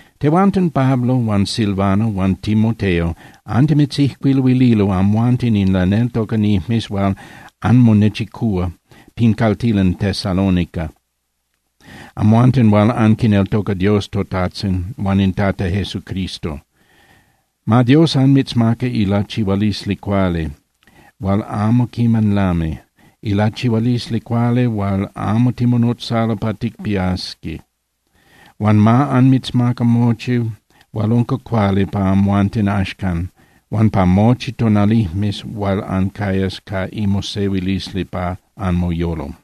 Tehuanten Pablo huan Silvano huan Timoteo antimitzijcuiluililo amhuanten in laneltocanijmes hual anmonechicúa pin caltilan Tesalónica, amhuanten hual anquineltoca Dios toTajtzin huan in Tata Jesucristo. Ma Dios anmitzmaca ilachihualisli cuali hual amo quiman lami, ilachihualisli cuali hual amo timonotzalo pa ticpiasqui. Huan ma anmitzmaca mochi hual unca cuali pa amhuanten axcan huan pa mochi tonalijmes hual ancayas ca imosehuilisli pa anmoyolo.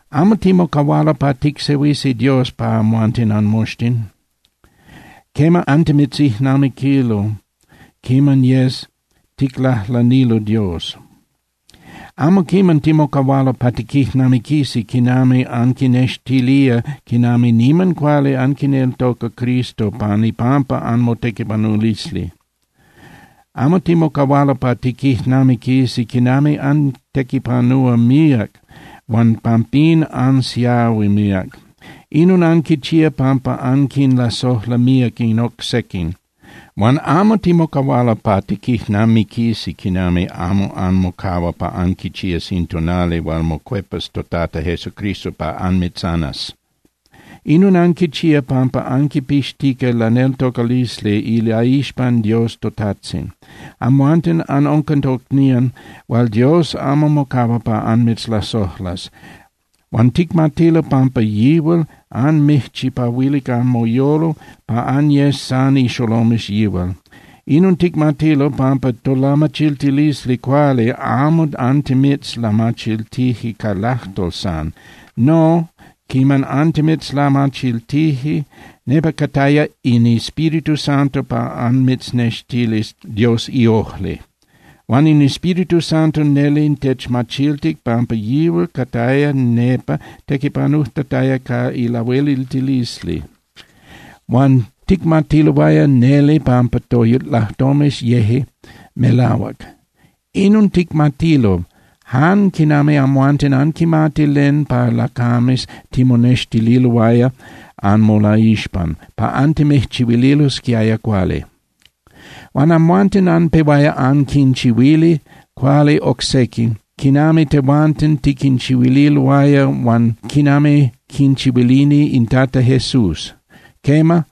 Amo timocahualo pa ticsehuisi Dios pa amhuanten anmoxtin. Quema, antimitzijnamiquilo quiman yes ticlajlanilo Dios. Amo quiman timocahualo pa tiquijnamiquisi quinami anquinextilía quinami niman cuali anquineltoca Cristo pan ipampa anmotequipanulisli. Amo timocahualo pa tiquijnamiquisi quinami antequipanúa míac huan pampín ansiahui míac. Inon anquichía pampa anquinlasojla míac in oc sequin. Huan amo timocahualo pa tiquijnamiquisi quinami amo anmocahua pa anquichías in tonali hual mocuepas toTata Jesucristo pa anmitzanas. Inon anquichía pampa anquipixtica laneltocalisli ilaixpan Dios toTajtzin. Amhuanten anunca tocnían hual Dios amo mocahua pa anmitzlasojlas. Huan ticmatilo pampa yihual anmijchipahuilic anmoyolo pa anyes san ixolomes yihual. Inon ticmatilo, pampa tolamachiltilisli cuali amo antimitzlamachiltije ca lajtol san. No, quiman antimitzlamachiltije, nepa cataya in Espíritu Santo pa anmitznextilis Dios iojli. Huan in Espíritu Santo neli techmachiltic pampa yihual cataya nepa tequipanujtataya ca ilahueliltilisli. Huan ticmatiloaya neli pampa tolajtomes yeje melahuac. Inon ticmatilo, jan quinami amhuanten anquimati len pa lacames timonextililoaya anmolaixpan, pa antimijchihuililosquiaya cuali. Huan amhuanten anpehuaya anquinchihuili cuali oc sequin quinami tehuanten tiquinchihuililoaya huan quinami quinchihuilini in Tata Jesús. Quema,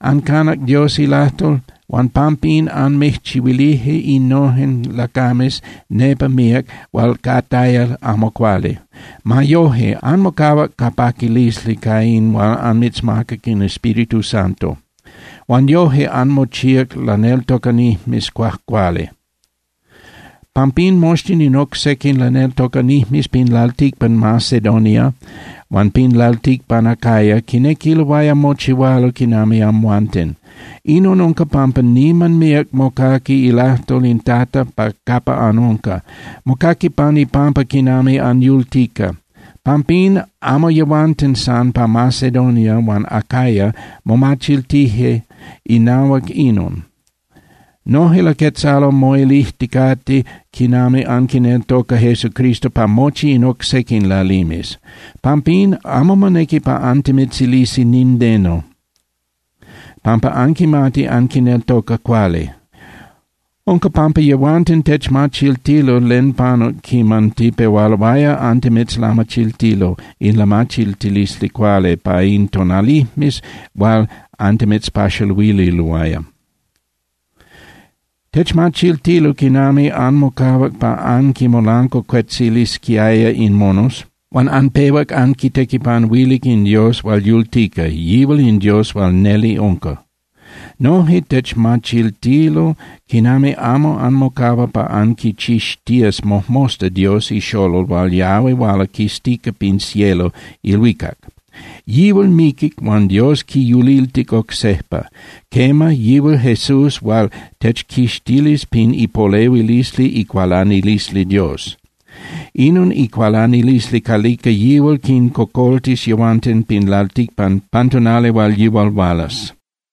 ancanac Dios ilajtol huan pampín anmijchihuilije innojen lacames nepa míac hual cataya amo cuali. Ma yoje, anmocahuac ca paquilisli ca in hual anmitzmacac in Espíritu Santo. Huan yoje anmochíac laneltocanijmes cuajcuali. Pampín moxtin in oc sequin laneltocanijmes pin lalticpan Macedonia huan pin lalticpan Acaya quinequiloaya mochihualo quinami amhuanten. Inon unca pampa niman míac mocaqui ilajtol in Tata capa anunca. Mocaqui pan ipampa quinami anyultica. Pampín amo yehuanten san pa Macedonia huan Acaya momachiltije inahuac inon. Noje laquetzalo moilijticate quinami anquineltoca Jesucristo pa mochi in oc sequin lalimes. Pampín amo monequi pa antimitzilisi nindeno, pampa anquimati anquineltoca cuali. Unca pampa yehuanten techmachiltilo len panuc quiman tipehualoaya antimitzlamachiltilo in lamachiltilisli cuali pa in tonalijmes hual antimitzpaxaluililoaya. Techmachiltilo quinami anmocahuac pa anquinmolancuacuetzilisquiaya in monos huan anpehuac anquitequipanuilic in Dios hual yultica, yihual in Dios hual neli unca. Noje techmachiltilo quinami amo anmocahua pa anquichixtías mojmosta Dios iXolol hual yahui huala quistica pin cielo (ilhuicac). Yihual miquic huan Dios quiyuliltic oc sejpa. Quema, yihual Jesús hual techquixtilis pin ipolehuilisli icualanilisli Dios. Inon icualanilisli calica yihual quincocoltis yehuanten pin lalticpan pan tonali hual yihual hualas.